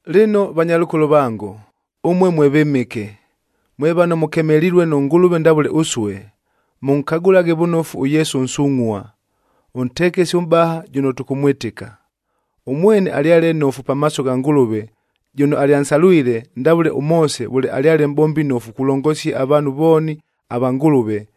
Lɨno, vanyalʉkolo vango, ʉmue mwe vɨmɨke, mwe vano mʉkemelilue nʉ Ngʉlʉve ndavʉle ʉsue, mʉnkagʉlaghe vʉnofu ʉYesu ʉnsungʼhua, ʉntekesi ʉmʼbaha jʉno tʉkʉmwɨtɨka. Ʉmwene alyale nnofu pamaaso gha Ngʉlʉve jʉno alyansalwile, ndavʉle ʉMoose vʉle alyale mʼbombi nnofu kulongosia avaanhu vooni ava Ngʉlʉve,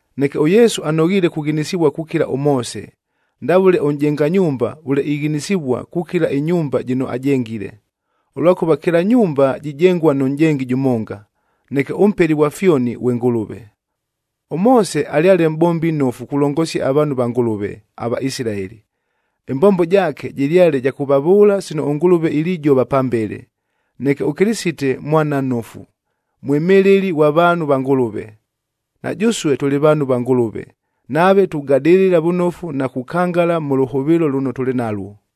Neke ʉYesu anoghiile kughinisivua kukila ʉMoose, ndavʉle ʉnʼjenga nyumba vʉle ighinisivua kukila ɨnyumba jɨno ajengile. Ʉlwakʉva kɨla nyumba jijengua nʉ nʼjengi jʉmonga, neke ʉMpeli ghwa fyoni ghwe Ngʉlʉve. ɄMoose alyale mʼbombi nnofu kulongosia avaanhu va Ngʉlʉve, aVaisilaeli. Ɨmbombo jaake jɨlyale ja kʉvavʉʉla sino ʉNgʉlʉve ilijova pambele. Neke ʉKɨlɨsite Mwana nnofu, mwɨmɨlɨli ghwa vaanhu va Ngʉlʉve. Na jʉsue tʉlɨ vaanhu va Ngʉlʉve, nave tugadɨlɨla vʉnofu na kukangala mʉ lʉhʉvɨɨlo lʉno tʉlɨ nalwo.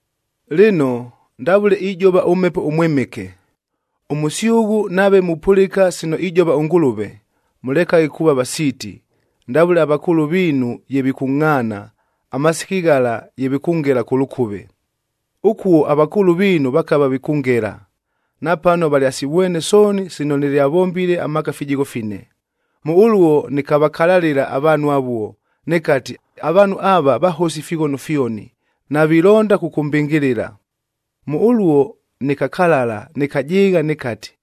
Lɨno, ndavʉle ijova ʉMhepo ʉMwɨmɨke, “Ʉmʉsyʉghʉ, nave mupʉlɨka sino ijova ʉNgʉlʉve, mʉlekaghe kuuva vasiiti, ndavʉle avakʉʉlʉ viinu ye vikʉngʼhaana, amasiki ghala ye vikʉngela kʉ lʉkʉve. Ʉkuo avakʉʉlʉ viinu vakava vikʉngela, napano valyasivwene sooni sino nɨlyavombile amaaka fijigho fine. Mʉ ʉluo nɨkavakalalɨla avaanhu avuo, nɨkati, ‘Avaanhu ava, vahosi ifighono fyoni, navilonda kʉkʉmbɨngɨlɨla.’ Mʉ ʉluo nɨkakalala, nɨkajɨɨgha, nɨkati,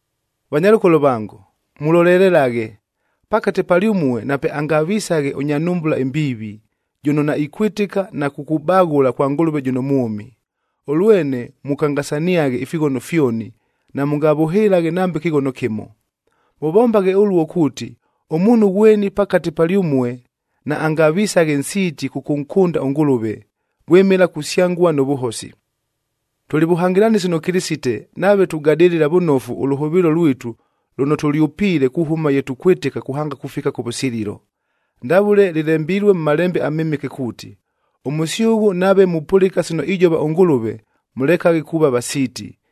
Vanyalʉkolo vango, mulolelelaghe, pakate palyʉmue napeangavisaghe ʉnya nhumbula ɨmbiivi, jʉno naikwɨtɨka na kukubaghʉla kwa Ngʉlʉve jʉno mwʉmi. Ʉlwene mʉkangasaniaghe ifighono fyoni, namʉngavʉhɨlaghe nambe kɨghono kɨmo. Mʉvombaghe ʉluo kuuti, ʉmuunhu ghweni pakate palyʉmue naangavisaghe nsiiti kʉkʉnkʉnda ʉNgʉlʉve, vwɨmɨla kusyangua nʉ vʉhosi. Tʉlɨ vʉhangɨlanɨsi nʉ Kɨlɨsite nave tugadɨlɨla vʉnofu ʉlʉhʉvɨɨlo lwitu lʉno tʉlyʉpiile kuhʉma ye tukwɨtɨka kuhanga kufika kʉvʉsililo. Ndavʉle lɨlembilue mʉ Malembe aMɨmɨke kuuti, “Ʉmʉsyʉghʉ, nave mupʉlɨka sino ijova ʉNgʉlʉve, mʉlekaghe kuuva vasiiti,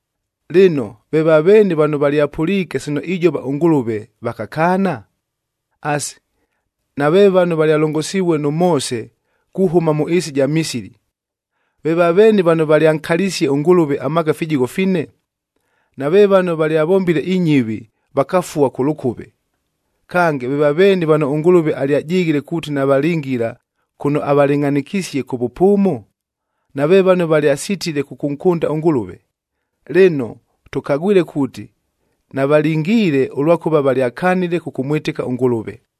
Lɨno, ve vaveeni vano valyapʉliike sino ijova ʉNgʉlʉve, vakakaana? Asi, nave vano valyalongosivue nʉ Moose kuhʉma mʉ ɨɨsi ɨja Misili! Ve vaveeni vano valyankalisie ʉNgʉlʉve amaaka fijigho fine? Nave vano valyavombile inyɨvi, vakafua kʉ lʉkʉve! Kange, ve vaveeni vano ʉNgʉlʉve alyajɨghile kuuti navalingila kʉno avalɨngʼhanɨkisie kʉ vʉpʉʉmo? Nave vano valyasitile kʉkʉnkʉnda ʉNgʉlʉve! Lɨno, tʉkagwile kuuti navalingiile, ʉlwakʉva valyakanile kʉkʉmwɨtɨka ʉNgʉlʉve.